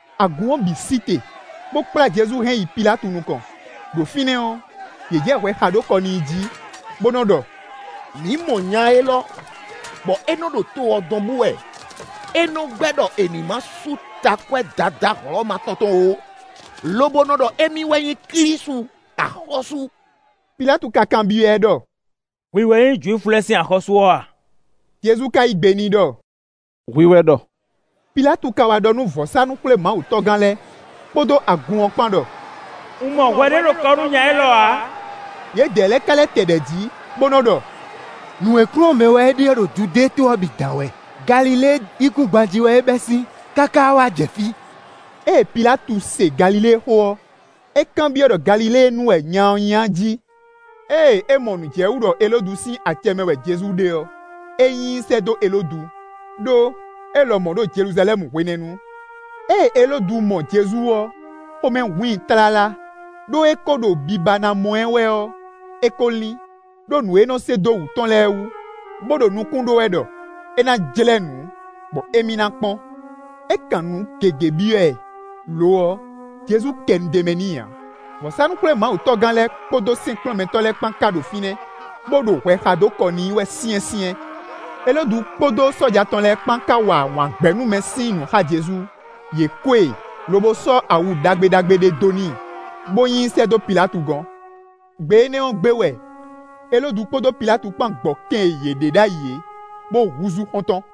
Agun ɔ́ bǐ sí te, bó kplá Jezu hɛn yi Pilátu nukɔn. Đo fínɛ́ ɔ́, yě jɛ hwɛ xa dó kɔ n'i jí, bó nɔ́ ɖɔ: “Mǐ mɔ nya élɔ́ bɔ é nɔ́ ɖo to ɔ́ dɔn bú wɛ. É nɔ́ gbɛ́ ɖɔ è nǐ má sú takwɛ́ Dadá Hlɔ̌ma tɔn tɔn ó, lobo nɔ ɖɔ émí wɛ nyí Klísu axɔ́sú.” Pilátu ka kanbyɔ́ ɛ ɖɔ: “Hwi wɛ nyí Jwifu lɛ́ɛ sín axɔ́sú ɔ́ a?” Jezu ka yí gbe n'i ɖɔ: “Hwi wɛ ɖɔ!” Pilátu ka wá ɖɔ nú vɔ̌sánú-xwlémawutɔ́gán lɛ́ɛ kpódó agun ɔ́ kpán ɖɔ: “Un mɔ hwɛ ɖě ɖo kɔ nú nya élɔ́ ǎ.” Yědɛɛ lɛ́ɛ ka lɛ́ tɛ ɖɛ̌ jí, bó nɔ́ ɖɔ: “Nǔ e kplɔ́n mɛ wɛ é ɖe ɔ́ ɖo Judée to ɔ́ bǐ dán wɛ; Galilée yíkúngban jí wɛ é bɛ́ sín, káká wá jɛ fí.” Ée Pilátu se Galilée xó ɔ́, é kanbyɔ́ ɖɔ Galiléenu wɛ nya ɔ́ nyí a jí. Ée é mɔ nǔ jɛ wú ɖɔ Elódu sín acɛ mɛ wɛ Jezu ɖe ɔ́, é nyi i sɛ́ dó Elódu, ɖó é lɔmɔ̌ ɖo Jeluzalɛ́mu hwenɛ́nu. Ée Elódu mɔ Jezu ɔ́, xomɛ hun i tlala; ɖó é kó ɖo biba ná mɔ ɛ wɛ ɔ́, é kó lín, ɖó nǔ e é nɔ́ se dó wǔ tɔn lɛ́ɛ wú, bó ɖo nukún ɖó wɛ ɖɔ é ná jlɛ́ nǔ bɔ émí ná kpɔ́n. É kan nǔ gěgé byɔ́ ɛ; lo ɔ́, Jezu kɛ nu d'é mɛ n'i ǎ. Vɔ̌sánú-xwlémawutɔ́gán lɛ́ɛ, kpódó sɛ́nkplɔ́nmɛtɔ́ lɛ́ɛ kpán ká ɖo fínɛ́, bó ɖo hwɛ xa dó kɔ n'i wɛ syɛ́nsyɛ́n. Elódu kpódó sɔ́ja tɔn lɛ́ɛ kpán ká wa wǎngbɛ́númɛ sín nǔ xá Jezu; yě ko e, lobo sɔ́ awu ɖagbe ɖagbe ɖé dó n'i, bó nyi i sɛ́ dó Pilátu gɔ́n. Gbe énɛ́ ɔ́ gbe wɛ Elódu kpódó Pilátu kpán gbɔ kɛn e yě ɖe ɖ'ayǐ é, bó húzú xɔ́ntɔn.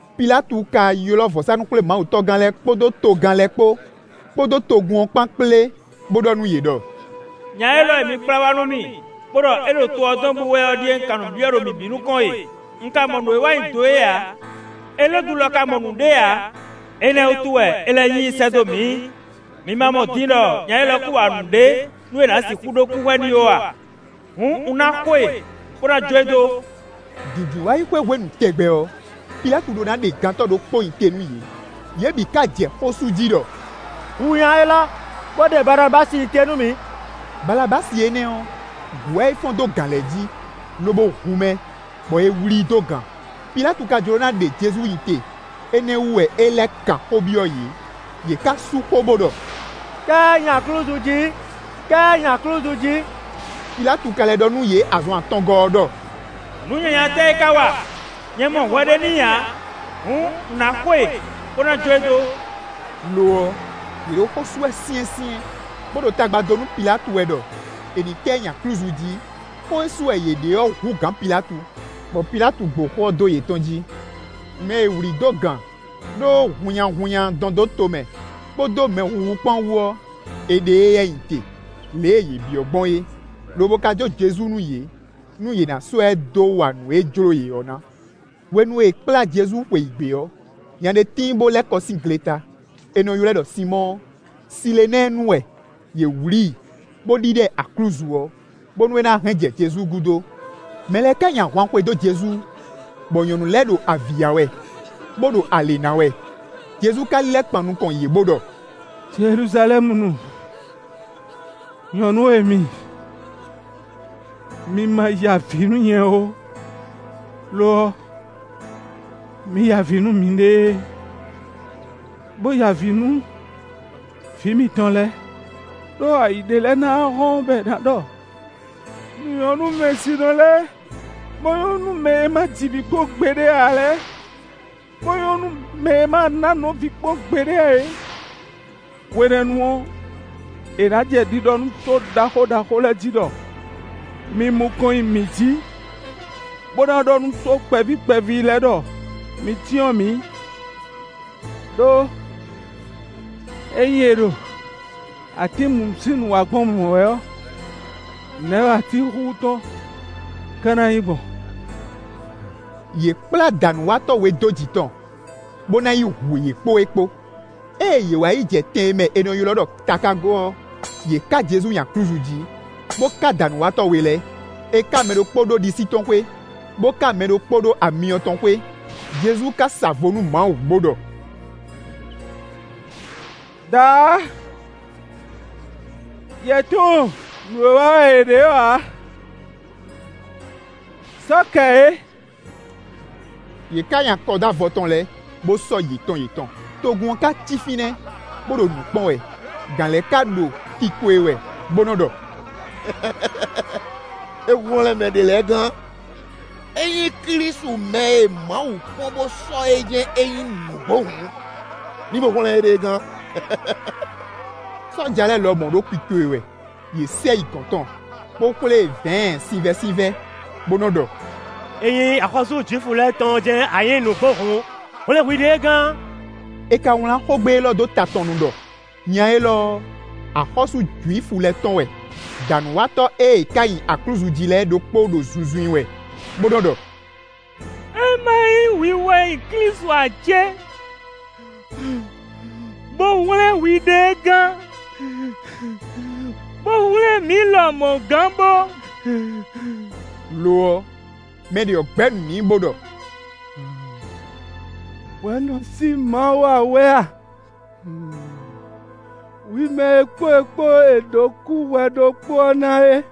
Pilátu ka ylɔ́ vɔ̌sánú-xwlémawutɔ́gán lɛ́ɛ kpódó togán lɛ́ɛ kpó, kpódó togun ɔ́ kpán kplé, bó ɖɔ nú yě ɖɔ: “Nya élɔ́ e mi kplá wá nú mì, bó ɖɔ é ɖo to ɔ́ dɔn bú wɛ ɔ́ ɖíe un kan nǔ byɔ́ ɖo mi bǐ nukɔn e; un ka mɔ nǔ e é wa nyi do é ǎ. Elódu lɔ ka mɔ nǔɖé ǎ; énɛ́ ɔ́ wútu wɛ é lɛ́ nyi i sɛ́ dó mǐ; mi ma mɔ din ɖɔ nya élɔ́ kún wa nǔɖé nú è nǎ sixú ɖó kúhwɛ n'i ó a? Hǔn, un ná xo e, bó ná jó e dó.” [ Dǐndínwáyixwe hwenu tɛgbɛ ɔ́, Pilátu ɖó ná ɖe gantɔ́ ɖokpó nyi te nú yě.] Yě bǐ ka jɛ xó sú jí ɖɔ: “Hu nya élɔ́, bó ɖe Balabási nyi te nú mǐ.” Balabási énɛ́ ɔ́, gǔ wɛ é fɔ́n dó gǎn lɛ́ɛ jí, lobo hu mɛ, bɔ è wlǐ i dó gan. Pilátu ka jló ná ɖe Jezu nyi te; énɛ́ wú wɛ é lɛ́ kan xó byɔ́ yě. Yě ká sú xó, bó ɖɔ: “Ká ɛ nyi aklúzu jí! Ká ɛ nyi aklúzu jí!” Pilátu ka lɛ́ ɖɔ nú yě azɔn atɔngɔ́ ɔ́ ɖɔ: “Nǔ nyanya tɛ́ é ká wa? Nyɛ mɔ hwɛ ɖě n'i ǎ. Hǔn, un ná xo e, bó ná jó e dó.” Lo ɔ́, yě ɖo xó sú wɛ syɛ́nsyɛ́n, bó ɖo tagba dó nú Pilátu wɛ ɖɔ è ní ká ɛ nyi aklúzu jí; xó e sú wɛ yě ɖe ɔ́ hú gǎn Pilátu, bɔ Pilátu gbo xó ɔ́ dó yětɔn jí. Mɛ e è wlǐ dó gan ɖó hunnyahunnya dɔn dó to mɛ, kpódó mɛ huhu kpán wú ɔ́, è ɖe éyɛ́ nyi te, lě e yě byɔ́ gbɔn é, lobo ka jó Jezu nú yě, nú yě ná sɔ́ ɛ dó wa nǔ e jló yě ɔ́ ná. Hwenu e è kplá Jezu xweyǐgbe ɔ́, nya ɖé tíin, bó lɛ́ kɔ sín gleta; è nɔ ylɔ́ ɛ ɖɔ Sinmɔ́ɔ; Silenɛ́ɛnu wɛ; yě wlí i, bó ɖíɖá ɛ aklúzu ɔ́, bónú é ná hɛn jɛ Jezu gúdo. Mɛ lɛ́ɛ ká nyi ahwan xwedó Jezu, bɔ nyɔ̌nu lɛ́ɛ ɖo avǐ ya wɛ, bó ɖo alě ná wɛ. Jezu ka lílɛ́ kpan nukɔn yě, bó ɖɔ: “Jeluzalɛ́munu nyɔ̌nu e mi, mi ma ya avǐ nú nyɛ ó; lo ɔ́, mi ya avǐ nú miɖée, bó ya avǐ nú vǐ mitɔn lɛ́ɛ. Đó ayǐ ɖé lɛ́ɛ ná wá hɔ́n, bɔ è nǎ ɖɔ: ‘Nǔ nyɔ́ nú wɛnsinɔ lɛ́ɛ, bó nyɔ́ nú mɛ e ma ji vǐ kpɔ́n gbeɖé ǎ lɛ́ɛ, bó nyɔ́ nú mɛ e ma ná anɔ̌ vǐ kpɔ́n gbeɖé ǎ é.’ Hwenɛ́nu ɔ́, è nǎ jɛ ɖiɖɔ nú só ɖaxó ɖaxó lɛ́ɛ jí ɖɔ: ‘Mi mu kɔn nyi mǐ jǐ!’ Bó ná ɖɔ nú só kpɛví kpɛví lɛ́ɛ ɖɔ: ‘Mi cyɔ́n mǐ.’ Đó ényí è ɖo atín mǔ sín nǔ wa gbɔn mɔ̌ wɛ ɔ́, nɛ̌ wɛ atín xúxú tɔn ka ná nyí gbɔn?” Yě kplá dǎnúwatɔ́ we dó jǐ tɔn, bó ná yi hu yě kpó é kpó. Ée yě wá yi jɛ tɛn e mɛ è nɔ ylɔ́ ɖɔ “takágo” ɔ́, yě ká Jezu nyi aklúzu jí, bó ká dǎnúwatɔ́ we lɛ́ɛ: è ká mɛ ɖokpó ɖó ɖisí tɔn xwé, bó ká mɛ ɖokpó ɖó amyɔ tɔn xwé. Jezu ka sa vo nú Mawu, bó ɖɔ: “Daá, yě tunwun nǔ e wa wɛ yě ɖe é ǎ; sɔ́ kɛ yě.” Yě ká nyi akɔ dó avɔ tɔn lɛ́ɛ, bó sɔ́ yětɔn yětɔn. Togun ɔ́ ka cí fínɛ́, bó ɖo nǔ kpɔ́n wɛ. Gǎn lɛ́ɛ ka ɖo kiko e wɛ, bó nɔ́ ɖɔ: “É hwlɛ́n mɛ ɖě lɛ́ɛ gán. Ényí Klísu mɛ e Mawu kpɔ́n bó sɔ́ é jɛ́n é nyí nǔgbó hǔn, ní bó hwlɛ́n éɖée gán.” Sɔ́ja lɛ́ɛ lɔmɔ̌ ɖo kiko e wɛ. Yě sɛ yi gɔ̌n tɔn, bó xwlé e vɛ̌ɛn sinvɛ́sinvɛ́, bó nɔ ɖɔ: “Ényí axɔ́sú Jwifu lɛ́ɛ tɔn jɛ́n a nyǐ nǔgbó hǔn, hwlɛ̌n hwiɖée gán.” È ka wlán xógbe élɔ́ dó ta tɔn nu ɖɔ: “Nya élɔ́ ɔ́, axɔ́sú Jwifu lɛ́ɛ tɔn wɛ.” Dǎnúwatɔ́ e è ka nyi aklúzu jí lɛ́ɛ ɖokpó ɖo zunzun i wɛ, bó nɔ́ ɖɔ: “É má nyí hwi wɛ nyí Klísu ǎ cé? Bo hwlɛ́n hwiɖée gán, bó hwlɛ́n mǐ lɔmɔ̌ gán bó!” Lo ɔ́, mɛ ɖě ɔ́ gbɛ́ nǔ n'i, bó ɖɔ: “Hwɛ nɔ sí Mawu ǎ wɛ a? Hwi mɛ e kpó é kpó è ɖǒ kúhwɛ ɖokpó ɔ́ na é.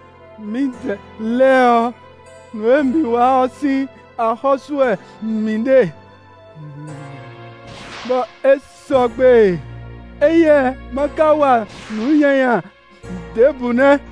Mǐdɛɛ lɛ́ɛ ɔ́, nǔ e mǐ wa ɔ́ sín axɔ́ sú wɛ mǐ ɖe, bɔ é sɔgbe; éyɛ́ má ká wa nǔ nyanya ɖěbǔ nɛ́!”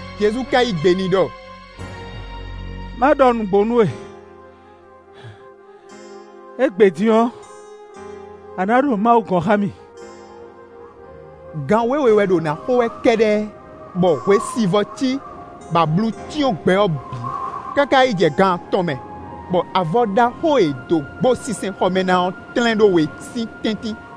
Jezu ka yí gbe n'i ɖɔ: “Má ɖɔ nǔgbó nú we: égbé din ɔ́, a nǎ ɖo Mawu gɔ̌n xá mì.” Gan wěwe wɛ ɖo na xo wɛ kɛ́ɖɛ́, bɔ hwesivɔ́ cí, bɔ ablu cyɔ́n gbɛ ɔ́ bǐ, káká yi jɛ gan atɔn mɛ, bɔ avɔ ɖaxó e è dó gbo sinsɛnxɔ mɛ ná ɔ́ tlɛ́n ɖó we sín tɛ́ntin.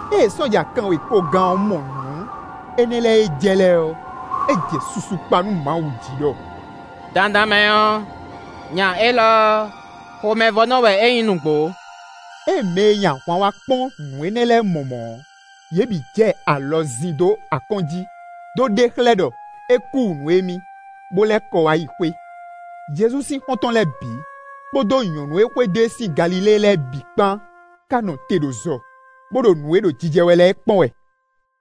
Ée sɔ́ja kanwekogán ɔ́ mɔ nǔ énɛ́ lɛ́ɛ e jɛ lɛ́ɛ ɔ́, é jɛ susu kpa nú Mawu jí ɖɔ: “Dandan mɛ ɔ́, nya élɔ́ ɔ́, xomɛvɔ́nɔ wɛ é nyí nǔgbó.” Ée mɛ e nyi ahwan wá kpɔ́n nǔ énɛ́ lɛ́ɛ mɔ mɔ̌ ɔ́, yě bǐ jɛ alɔ zin dó akɔ́n jí, dó ɖe xlɛ́ ɖɔ é kú wǔ nú émí, bó lɛ́ kɔ wá yi xwé. Jezu sín xɔ́ntɔn lɛ́ɛ bǐ, kpódó nyɔ̌nu e xwedó e sín Galilée lɛ́ɛ bǐ kpan ka nɔ te ɖo zɔ, bó ɖo nǔ e ɖo jijɛ wɛ lɛ́ɛ kpɔ́n wɛ.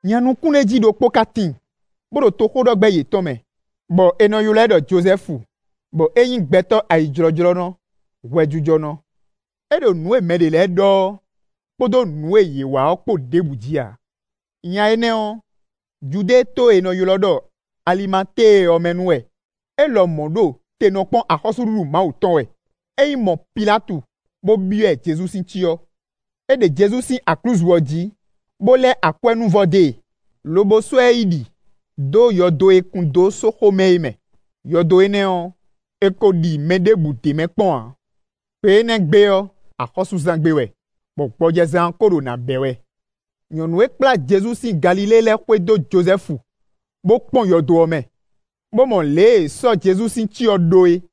Nya nukúnɖéjí ɖokpó ka tíin, bó ɖo toxóɖɔgbɛ́ yětɔn mɛ, bɔ è nɔ ylɔ́ ɛ ɖɔ Jozɛ́fu, bɔ é nyí gbɛtɔ́ ayijlɔ́jlɔ́nɔ, hwɛjijɔnɔ. É ɖo nǔ e mɛ ɖě lɛ́ɛ ɖɔ ɔ́ kpódó nǔ e yě wa ɔ́ kpó ɖěbǔ jí ǎ. Nya énɛ́ ɔ́ Judée to e è nɔ ylɔ́ ɖɔ Alimatée ɔ́ mɛ nu wɛ. É lɔmɔ̌ ɖo te nɔ kpɔ́n axɔ́súɖuɖu Mawu tɔn wɛ. É yi mɔ Pilátu, bó byɔ́ ɛ Jezu sín cyɔ. É ɖe Jezu sín aklúzu ɔ́ jí, bó lɛ́ akwɛ́núvɔ dó e, lobo sɔ́ ɛ yi ɖi dó yɔdo e è kun dó sóxo mɛ é mɛ; yɔdo énɛ́ ɔ́, è ko ɖi mɛ ɖěbǔ d'é mɛ kpɔ́n ǎ. Gbe énɛ́ gbe ɔ́, axɔ́súzán gbe wɛ bɔ gbɔjɛzán ɔ́ ko ɖo nǎ bɛ́ wɛ. Nyɔ̌nu e kplá Jezu sín Galilée lɛ́ɛ xwedó Jozɛ́fu, bó kpɔ́n yɔdo ɔ́ mɛ, bó mɔ lě e è sɔ́ Jezu sín cyɔ ɖó é.